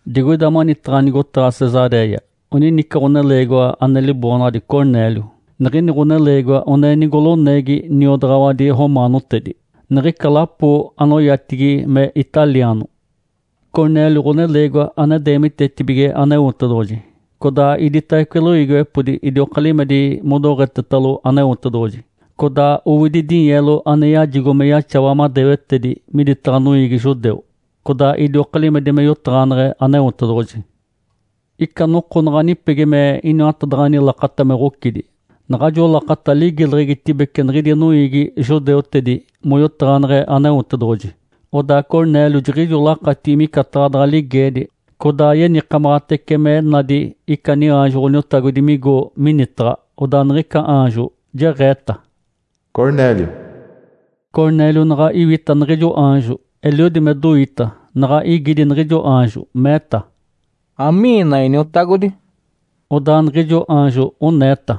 Digoida manitaɡ̶a nigotaɡ̶a Cesaréia oninica ɡ̶oneleegiwa ane liboonaɡ̶adi Cornélio. Niɡ̶ini ɡ̶oneleegiwa one nigoloneegi niodaɡ̶awadi romaanotedi, niɡ̶ica lapo anoyatigi me “Italiano”. Cornélio ɡ̶oneleegiwa ane deemitetibige Aneotedoɡ̶oji, codaa iditawece loiigiwepodi idioka limedi modoɡ̶etetalo Aneotedoɡ̶oji. Codaa owidi dinyeelo ane yajigo me yaxawa madewetedi miditaɡ̶a noiigi judeu, codaa idioka limedi me yotaɡ̶aneɡ̶e Aneotedoɡ̶oji. Ica noko naɡ̶a nipegi me iniwatadaɡ̶ani lakata me ɡ̶ocidi, naɡ̶ajo lakata ligileɡ̶egitibece niɡ̶idi noiigi judeutedi moyotaɡ̶aneɡ̶e Aneotedoɡ̶oji. Odaa Cornélio jiɡ̶ijo lakatigi micataɡ̶a daɡ̶a ligeedi, codaa yenikamaɡ̶atece me nadi ica niaanjo Ǥoniotagodi migo minitaɡ̶a. Odaa niɡ̶ica aanjo jeɡ̶eeta, “Cornélio!” Cornélio naɡ̶a iwita niɡ̶ijo aanjo, eliodi me doita, naɡ̶a igidi niɡ̶ijo aanjo, meeta, “Amiina, iniotagodi?” Odaa niɡ̶ijo aanjo oneeta,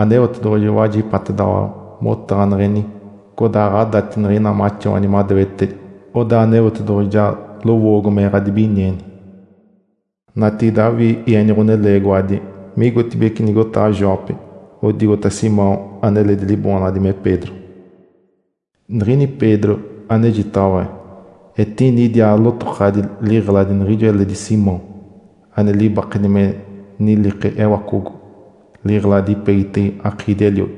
“Aneotedoɡ̶oji wajipatedaɡ̶awa motaɡ̶aneɡ̶eni, codaa ɡ̶adati niɡ̶ina maxawani madewetedi. Odaa Aneotedoɡ̶oji ja lowoogo me ɡ̶adibinieni. Natigide awii ieni ɡ̶oneleegiwadi migotibeci nigotaɡ̶a Jope odigota Simão aneledi liboonaɡ̶adi me Pedro. Niɡ̶ini Pedro anejitaɡ̶awa etini idiaa lotokaɡ̶adi liɡ̶eladi niɡ̶ijo eledi Simão ane libakedi me nilike ewacogo, liɡ̶eladi ipegitege akiidi-eliodi.”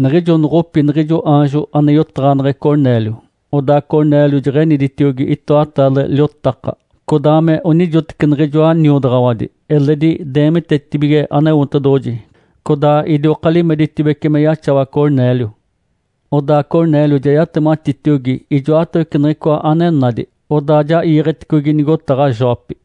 Niɡ̶ijo noɡ̶opi niɡ̶ijo aanjo ane yotaɡ̶aneɡ̶e Cornélio, odaa Cornélio jeɡ̶eniditiogi itoataale liotaka, codaa me onijoteci niɡ̶ijoa niodaɡ̶awadi, eledi deemitetibige Aneotedoɡ̶oji codaa idioka limeditibece me yaxawa Cornélio. Odaa Cornélio ja yatematitiogi ijoatawece niɡ̶icoa ane nadi, odaa ja iiɡ̶eticogi nigotaɡ̶a Jope.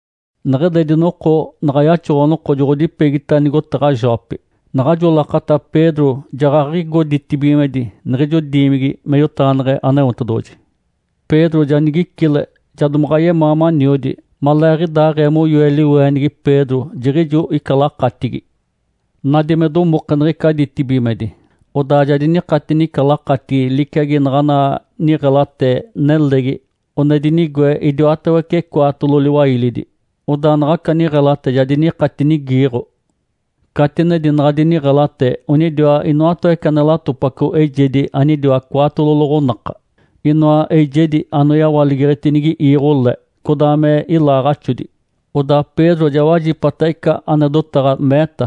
Neɡ̶eledi noko naɡ̶a yaxoɡ̶o-noko joɡ̶odipegita nigotaɡ̶a Jope. Naɡ̶ajo lakata Pedro jaɡ̶aɡ̶igo ditibigimedi niɡ̶ijo diimigi me yotaɡ̶aneɡ̶e Aneotedoɡ̶oji. Pedro ja nigicile, ja domaɡ̶a yemaa maniodi. Maleeɡ̶idaaɡ̶ee moyoe liweenigi, Pedro jiɡ̶ijo ica lakatigi. Nadi me domoke niɡ̶ica ditibigimedi, odaa ja dinikatini ica lakatigi liciagi naɡ̶ana niɡ̶elate nelegi one dinigoe idiwatawece cwaatolo liwailidi. Odaa naɡ̶aca niɡ̶elate ja dinikatinigiiɡ̶o. Catinedi naɡ̶adi niɡ̶elate onidiwa inoatawece ane latopaco eijedi anidiwa cwaatolo loɡ̶onaka, inoa eijedi anoyawaligeɡ̶etinigi iiɡ̶o le, codaa me ilaaɡ̶axodi. Odaa Pedro ja wajipata ica ane dotaɡ̶a, meeta,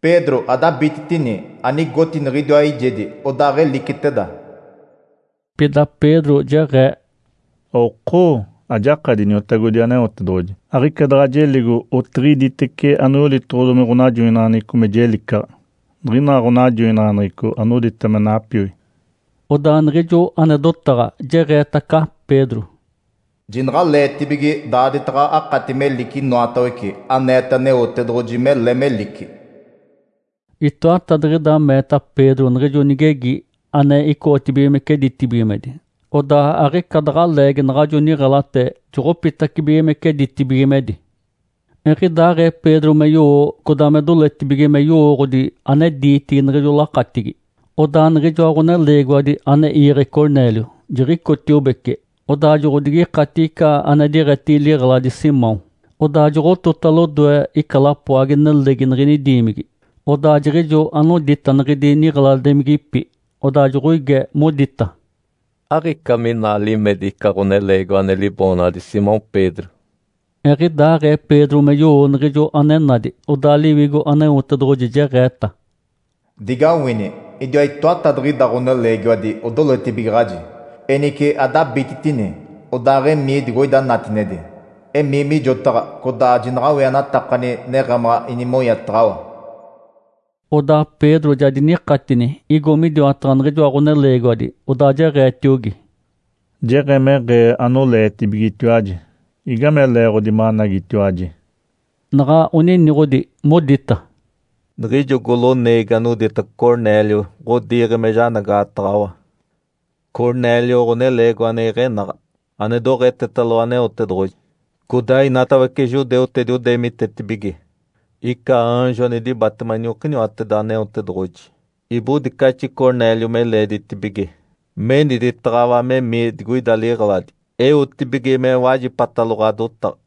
“Pedro, adabititini, anigoti niɡ̶idiwa eijedi, odaaɡ̶eliciteda!” Pida Pedro jeɡ̶ee, “Okoo, ajakadi Iniotagodi Aneotedoɡ̶oji! Aɡ̶ica daɡ̶a jeligo otiɡ̶iditece anoyolitoɡ̶odomi ɡ̶onajoinaɡ̶aneɡ̶eco me jelicaɡ̶a, niɡ̶ina ɡ̶onajoinaɡ̶aneɡ̶eco anodita me napioi.” Odaa niɡ̶ijo ane dotaɡ̶a jeɡ̶eetaca Pedro, “Jinaɡ̶aleetibige daaditaɡ̶a akati melici inoatawece aneete Aneotedoɡ̶oji mele melici!” Itoatadiɡ̶ida meeta Pedro niɡ̶ijo nigegi ane icoɡ̶otibigimece ditibigimedi. Odaa aɡ̶ica daɡ̶a leegi naɡ̶ajo niɡ̶elate joɡ̶opitacibigimece ditibigimedi. Eɡ̶idaaɡ̶ee Pedro me yowo codaa me doletibige me yowooɡ̶odi ane diitigi niɡ̶ijo lakatigi, odaa niɡ̶ijoa ɡ̶oneleegiwadi ane iiɡ̶e Cornélio jiɡ̶icotiobece odaa joɡ̶odigikatigi ica ane diɡ̶etigi liɡ̶eladi Simão, odaa joɡ̶otota lodoe ica lapoagi-nelegi niɡ̶ini diimigi. Odaa jiɡ̶ijo onidita niɡ̶idi niɡ̶eladimigipi, odaa joɡ̶oige, modita, “Aɡ̶ica mina limedi ica ɡ̶oneleegiwa ane liboonaɡ̶adi Simão Pedro?” Eɡ̶idaaɡ̶ee Pedro me yowo niɡ̶ijo ane nadi, odaa Liwigo Aneotedoɡ̶oji jeɡ̶eeta, “Digawini! Idiwa itoatadiɡ̶ida ɡ̶oneleegiwadi odoletibigaɡ̶aji. Enice adabititini, odaaɡ̶emii digoida natinedi. Emii mijotaɡ̶a, codaa jinaɡ̶awienatakani neɡ̶emaɡ̶a inimonyataɡ̶awa.” Odaa Pedro ja dinikatini, igo midiwataɡ̶a niɡ̶ijoa ɡ̶oneleegiwadi, odaa jeɡ̶eetiogi, “Jeɡ̶emeɡ̶ee anoleetibigetiwaji. Igame leeɡ̶odi managitiwaji?” Naɡ̶a oniniɡ̶odi, modita, “Niɡ̶ijo goloneegi anodita Cornélio ɡ̶odiiɡ̶e me janagaɡ̶ataɡ̶awa. Cornélio ɡ̶oneleegiwa ane iɡ̶enaɡ̶a, ane doɡ̶etetalo Aneotedoɡ̶oji. Codaa inatawece judeutedi odeemitetibige. Ica aanjo ane dibatema iniokiniwateda Aneotedoɡ̶oji ibodicaxi Cornélio me leeditibige meniditaɡ̶awa memii digoida liɡ̶eladi eotibige me wajipatalo ɡ̶adotaɡ̶a.”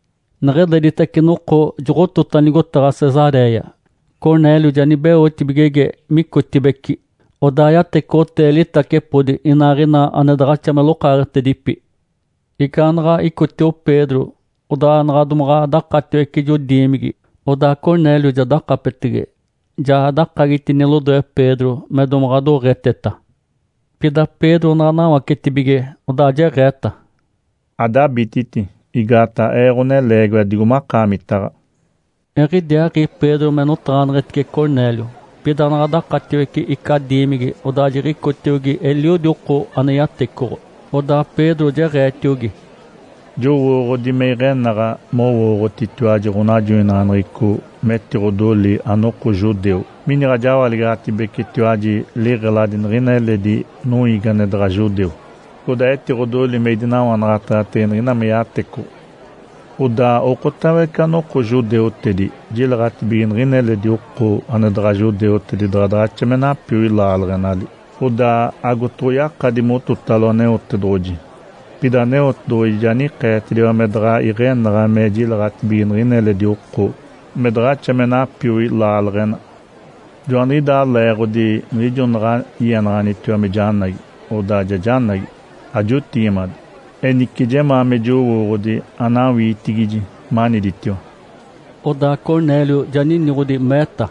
Neɡ̶eleditace noko joɡ̶otota nigotaɡ̶a Cesaréia, Cornélio ja nibeotibigege micotibeci, odaa yatecoɡ̶otee litacepodi inaaɡ̶ina ane daɡ̶axa me lokaaɡ̶etedipi. Igaanaɡ̶a icotio Pedro odaa naɡ̶a domaɡ̶a dakatiwece ijo diimigi, odaa Cornélio ja dakapetege, ja dakagitini lodoe Pedro me domaɡ̶a doɡ̶eteta. Pida Pedro naɡ̶a nawacetibige odaa jeɡ̶eeta, “Adabititi! Igaataɡ̶a ee ɡ̶oneleegiwa digo makaamitaɡ̶a.” Eɡ̶idiaaɡ̶i Pedro me notaɡ̶aneɡ̶etice Cornélio, pida naɡ̶a dakatiwece ica diimigi, odaa jiɡ̶icotiogi eliodi oko ane yatecoɡ̶o. Odaa Pedro jeɡ̶eetiogi, “Jowooɡ̶odi me iɡ̶enaɡ̶a mowooɡ̶otitiwaji ɡ̶onajoinaɡ̶aneɡ̶eco metiɡ̶odoli anoko judeu miniɡ̶a jawaligaɡ̶atibecitiwaji liɡ̶eladi niɡ̶ina eledi noiigi ane daɡ̶a judeu, codaa etiɡ̶odoli me idinawanaɡ̶ataɡ̶atege niɡ̶ina me yatecoɡ̶o. Odaa okotawece anoko judeutedi jileɡ̶atibige niɡ̶ina eledi oko ane daɡ̶a judeutedi daɡ̶a daɡ̶axa me napioi laaleɡ̶enali, odaa agotoɡ̶oyakadi mototalo Aneotedoɡ̶oji. Pida Aneotedoɡ̶oji ja nikeetediwa me daɡ̶a iɡ̶enaɡ̶a me jileɡ̶atibige niɡ̶ina eledi oko me daɡ̶axa me napioi laaleɡ̶ena. Joaniɡ̶idaa leeɡ̶odi niɡ̶ijo naɡ̶a ienaɡ̶anitiwa me janagi, odaa ja janagi, ajotigimade. Enice jemaa me jowooɡ̶odi anawiitigiji maniditiwa.” Odaa Cornélio ja niniɡ̶odi, meeta,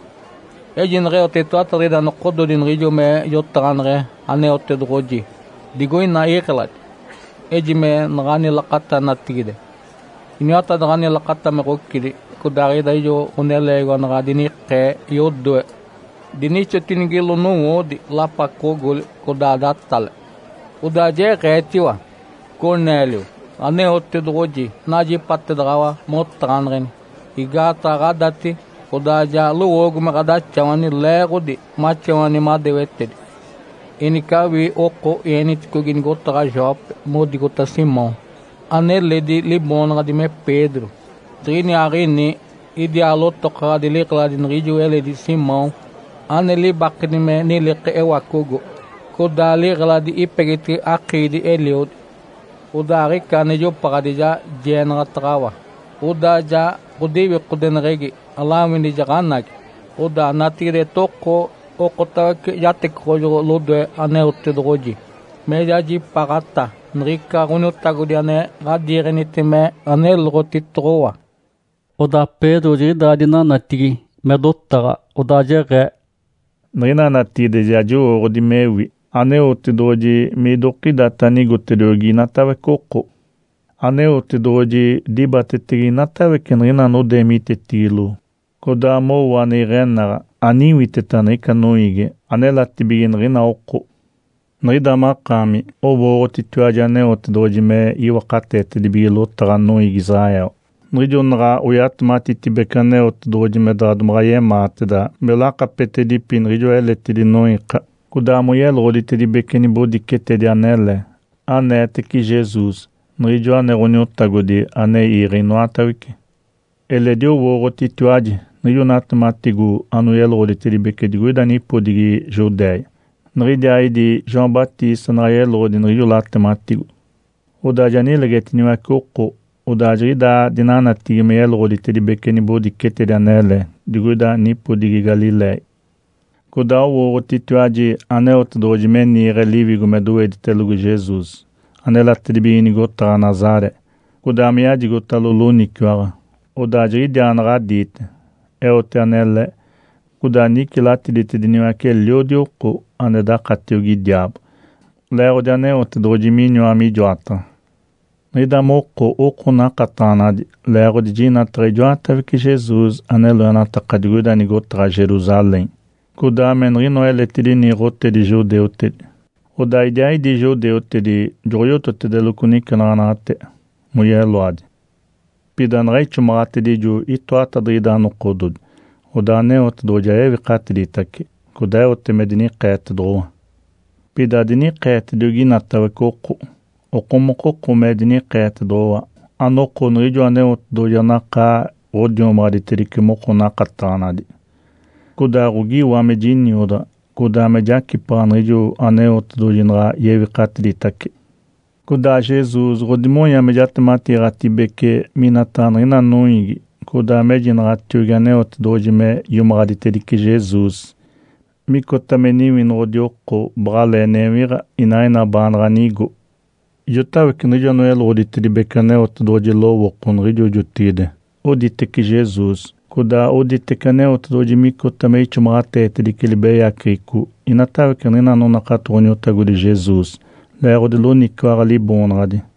“Eji neɡ̶eote itoatadiɡ̶ida nokododi niɡ̶ijo me jotaɡ̶aneɡ̶e Aneotedoɡ̶oji digoina iɡ̶eladi, ejime naɡ̶ani lakata natigide, iniwatadaɡ̶ani lakata me ɡ̶ocidi. Codaaɡ̶ida ijo ɡ̶oneleegiwa naɡ̶a dinikee yodoe, dinixotinigilo nowoodi lapacoɡ̶ogoli, codaa datale. Odaa jeɡ̶eetiwa, ‘Cornélio, Aneotedoɡ̶oji najipatedaɡ̶awa motaɡ̶aneɡ̶eni. Igaataɡ̶a ɡ̶adati, odaa ja lowoogo me ɡ̶adaxawani leeɡ̶odi maxawani madewetedi. Enice awii oko ieniticogi nigotaɡ̶a Jope modigota Simão, aneledi liboonaɡ̶adi me Pedro. Jiɡ̶iniaaɡ̶ini idiaa lotokaɡ̶adi liɡ̶eladi niɡ̶ijo eledi Simão ane libakedi me nilike ewacogo, codaa liɡ̶eladi ipegitege akiidi-eliodi.’ Odaa aɡ̶ica ane jopaɡ̶adi ja jienaɡ̶ataɡ̶awa, odaa ja ɡ̶odiwikodeneɡ̶egi alawini jaɡ̶anagi. Odaa natigide etoko okotawece jatecoɡ̶ojoɡ̶o lodoe Aneotedoɡ̶oji me jajipaaɡ̶ata niɡ̶ica Ǥoniotagodi ane ɡ̶adiiɡ̶enite me aneloɡ̶otitoɡ̶owa.” Odaa Pedro jiɡ̶idaa dinanatigi me dotaɡ̶a, odaa jeɡ̶ee, “Niɡ̶ina natigide ja jowooɡ̶odi mewi Aneotedoɡ̶oji midokidata anigotediogi inatawece oko. Aneotedoɡ̶oji dibatetege inatawece niɡ̶ina anodeemitetigilo codaa mowo ane iɡ̶enaɡ̶a, aniwiteta niɡ̶ica noiigi anelatibige niɡ̶ina oko. Niɡ̶ida makaami owooɡ̶otitiwaji Aneotedoɡ̶oji me iwakateetedibige lotaɡ̶a noiigi Israel, niɡ̶ijo naɡ̶a oyatematitibece Aneotedoɡ̶oji me daɡ̶a domaɡ̶a yemaateda me lakapetedipi niɡ̶ijoa eletidi noiika, codaa moyeloɡ̶oditedibece nibodicetedi anele aneetece Jesus Niɡ̶ijoa ane Ǥoniotagodi ane iiɡ̶e inoatawece. Eledi owooɡ̶otitiwaji niɡ̶ijo natematigo anoyeloɡ̶oditedibece digoida nipodigi Judéia. Niɡ̶idiaaɡ̶idi João Batista naɡ̶a yeloɡ̶odi niɡ̶ijo latematigo, odaa ja nilegetiniwace oko, odaa jiɡ̶idaa dinanatigi moyeloɡ̶oditedibece nibodicetedi anele digoida nipodigi Galiléia. Codaa owooɡ̶otitiwaji Aneotedoɡ̶oji me niiɡ̶e Liwigo me doweditelogo Jesus anelatedibige nigotaɡ̶a Nazaré, codaa me yajigotalo loniciwaɡ̶a. Odaa jiɡ̶idiaa naɡ̶a diite, eote anele, codaa nicilatiditediniwace eliodi oko ane dakatiogi diaabo, leeɡ̶odi Aneotedoɡ̶oji miniwa mijoataɡ̶a. Niɡ̶ida moko oko nakataɡ̶anadi leeɡ̶odi jinataɡ̶a ijoatawece Jesus ane loenataka digoida nigotaɡ̶a Jerusalém, codaa me niɡ̶inoa eletidi niiɡ̶otedi judeutedi. Odaa idiaaɡ̶idi judeutedi joɡ̶oyototedeloco nicenaɡ̶anaɡ̶ate moyeloadi. Pida naɡ̶a ixomaɡ̶atedijo itoatadiɡ̶ida nokododi, odaa Aneotedoɡ̶oji ja yewikatiditace, codaa eote me dinikeetedoɡ̶owa. Pida adinikeetediogi inatawece oko, okomokoko me dinikeetedoɡ̶owa, anoko niɡ̶ijo Aneotedoɡ̶oji anakaa ɡ̶odiomaɡ̶aditedice moko nakataɡ̶anadi. Codaa ɡ̶ogiiwa me jiniodaɡ̶a, codaa me jacipaɡ̶a niɡ̶ijo Aneotedoɡ̶oji naɡ̶a yewikatiditace. Codaa Jesus ɡ̶odimonya me jatematiiɡ̶atedibece minataɡ̶a niɡ̶ina noiigi codaa mejinaɡ̶atiogi Aneotedoɡ̶oji me iomaɡ̶aditedice Jesus micota me Niwinoɡ̶odi oko baɡ̶alee newiɡ̶a inaaɡ̶ina baanaɡ̶a nigo. Ijotawece niɡ̶ijo anoyeloɡ̶oditedibece Aneotedoɡ̶oji lowooko niɡ̶ijo jotigide oditece Jesus, codaa oditece Aneotedoɡ̶oji micota me ixomaɡ̶ateetedice libeyaceɡ̶eco inatawece niɡ̶ina anonakato Ǥoniotagodi Jesus leeɡ̶odi loniciwaɡ̶a Liboonaɡ̶adi.”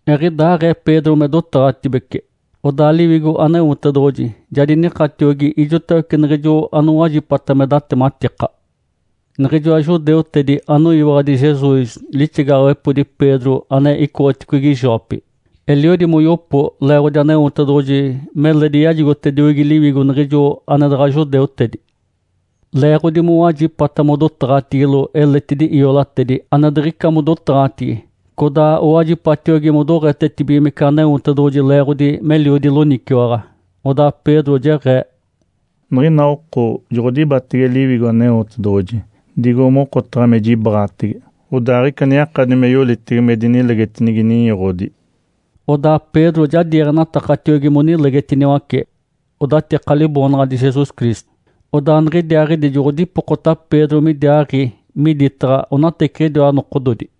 Eɡ̶idaaɡ̶ee Pedro me dotaɡ̶atibece, odaa Liwigo Aneotedoɡ̶oji ja dinikatiogi ijotawece niɡ̶ijo anowajipata me datematika. Niɡ̶ijoa judeutedi anoyiwaɡ̶adi Jesus lixigaɡ̶awepodi Pedro ane icoɡ̶oticogi Jope, eliodi moyopo leeɡ̶odi Aneotedoɡ̶oji meledi yajigotediogi Liwigo niɡ̶ijo ane daɡ̶a judeutedi. Leeɡ̶odi mowajipata modotaɡ̶atigilo eletidi iolatedi ane diɡ̶ica modotaɡ̶atigi codaa owajipatiogi modoɡ̶etetibigimece Aneotedoɡ̶oji leeɡ̶odi meliodi loniciwaɡ̶a. Odaa Pedro jeɡ̶ee, “Niɡ̶ina oko joɡ̶odibatege Liwigo Aneotedoɡ̶oji digo mokotaɡ̶a me jibaɡ̶atege. Odaa aɡ̶ica ane yakadi me yolitege me dinilegetinigi ninyoɡ̶odi.” Odaa Pedro ja diiɡ̶enatakatiogi monilegetiniwace odatika Liboonaɡ̶adi Jesus Cristo. Odaa niɡ̶idiaaɡ̶idi joɡ̶odipokota Pedro midiaaɡ̶i miditaɡ̶a onateciɡ̶idiwa nokododi.